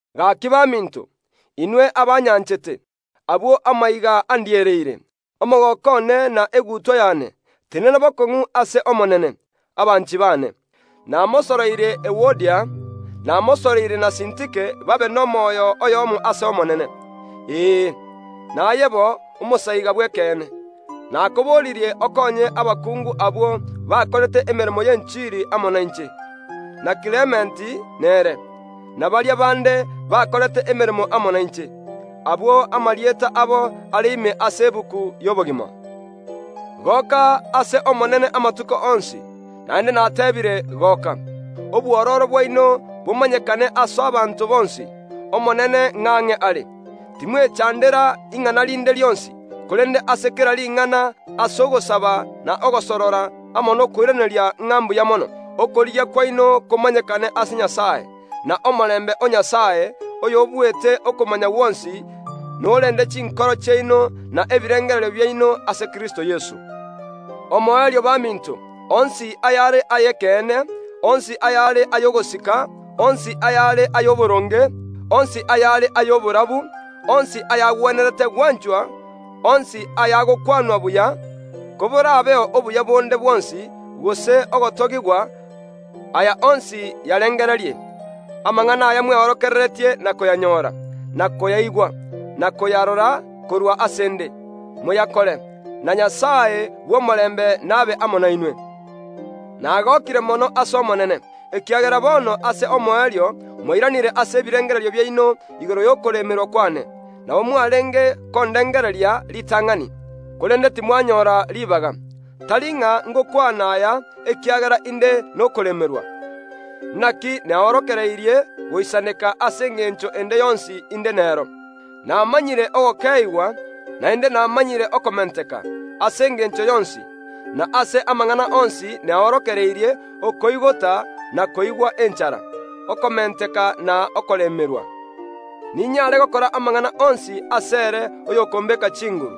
Gaki baminto, inwe abanyanchete, abwo amaiga andiereire, omogooko one na egutwa yane, tenena bokong’u ase Omonene, abanchi baane. Namosoroire Ewodia, namosoroire na Sintike babe nomoyo oyomo ase Omonene. Ee, naye bo, omosaiga bw’ekeene, nakoboririe okonye abakungu abwo bakorete emeremo y’enchiri amo nainche, na Klementi nere, na baria bande bakorete emeremo amo nainche, abwo amarieta abo are ime ase egetabu y’obogima. Goka ase Omonene amatuko onsi; naende natebiire: Goka! Obwororo bwaino bomanyekane ase abanto bonsi. Omonene ng’ang’e are. Timwechandera ing’ana rinde rionsi; korende ase kera ring’ana ase ogosaba na ogosorora amo nokoiraneria ng’a mbuya mono, okorigia kwaino komanyekane ase Nyasae. Na omorembe o Nyasae, oyobuete okomanya gwonsi, korende chinkoro chiaino na ebirengererio biaino ase Kristo Yeso. Omoerio baminto, onsi ayare ay’ekeene, onsi ayare ay’ogosika, onsi ayare ay’oboronge, onsi ayare ay’oborabu, onsi ayagwenerete gwanchwa, onsi ayagokwanwa buya; koborabeo obuya bonde bwonsi, gose ogotogigwa, aya onsi yarengererie. Amang’ana aya mweorokereretie na koyanyora, na koyaigwa, na koyarora korwa ase ’nde, moyakore, na Nyasae bw’omorembe nabe amo nainwe. Nagokire mono ase Omonene, ekiagera bono ase omoerio mwairanire ase ebirengererio biaino igoro y’okoremerwa kwane; nabo mwarenge kondengereria ritang’ani, korende timwanyora ribaga. Tari ng’a ngokwana aya ekiagera inde nokoremerwa, naki neorokereirie goisaneka ase engencho ende yonsi inde nero. Namanyire ogokeeigwa, naende namanyire okomenteka; ase engencho yonsi, na ase amang’ana onsi neorokereirie, okoigota na koigwa enchara, okomenteka na okoremerwa. Ninyare gokora amang’ana onsi asere oyokombeka chinguru.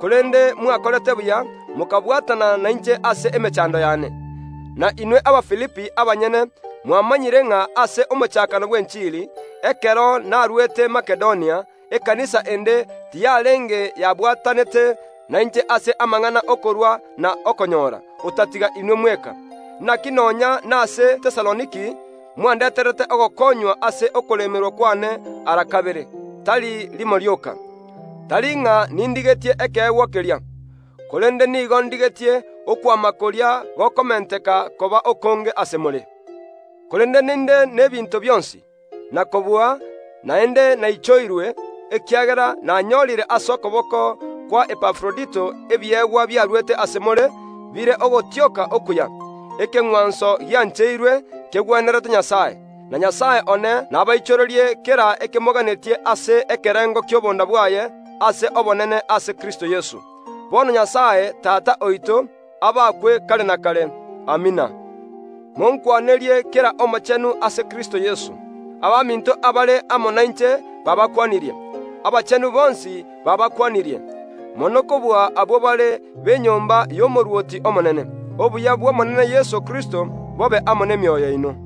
Korende mwakorete buya mokabwatana nainche ase emechando yane. Na inwe Abafilipi abanyene mwamanyire ng’a ase omochakano bw’enchiri, ekero naruete Makedonia, ekanisa ende tiyarenge yabwatanete nainche ase amang’ana ’okorua na okonyora, otatiga inwe mweka. Naki nonya nase Tesaloniki mwandeterete ogokonywa ase okoremerwa kwane ara kabere, tari rimo rioka. Tari ng’a nindigetie ekeegwa keria, korende nigo ndigetie okwama koria gokomenteka koba okonge ase more. Korende ninde n’ebinto bionsi, na kobua; naende naichoirwe, ekiagera nanyorire ase okoboko kwa Epafrodito ebiegwa biaruete ase more, bire ogotioka okuya, ekeng’wanso giancheirwe, kegwenerete Nyasae. Na Nyasae one nabaichorerie kera ekimoganetie ase ekerengo ki’obonda bwaye ase obonene ase Kristo Yeso. Bono Nyasae, Tata oito, abakwe kare na kare. Amina. Monkwanerie kera omochenu ase Kristo Yeso. Abaminto abare amo nainche baabakwanirie. Abachenu bonsi baabakwanirie, mono kobua abwo bare b’enyomba y’omorwoti omonene. Obuya bw’Omonene Yeso Kristo bobe amo nainwe.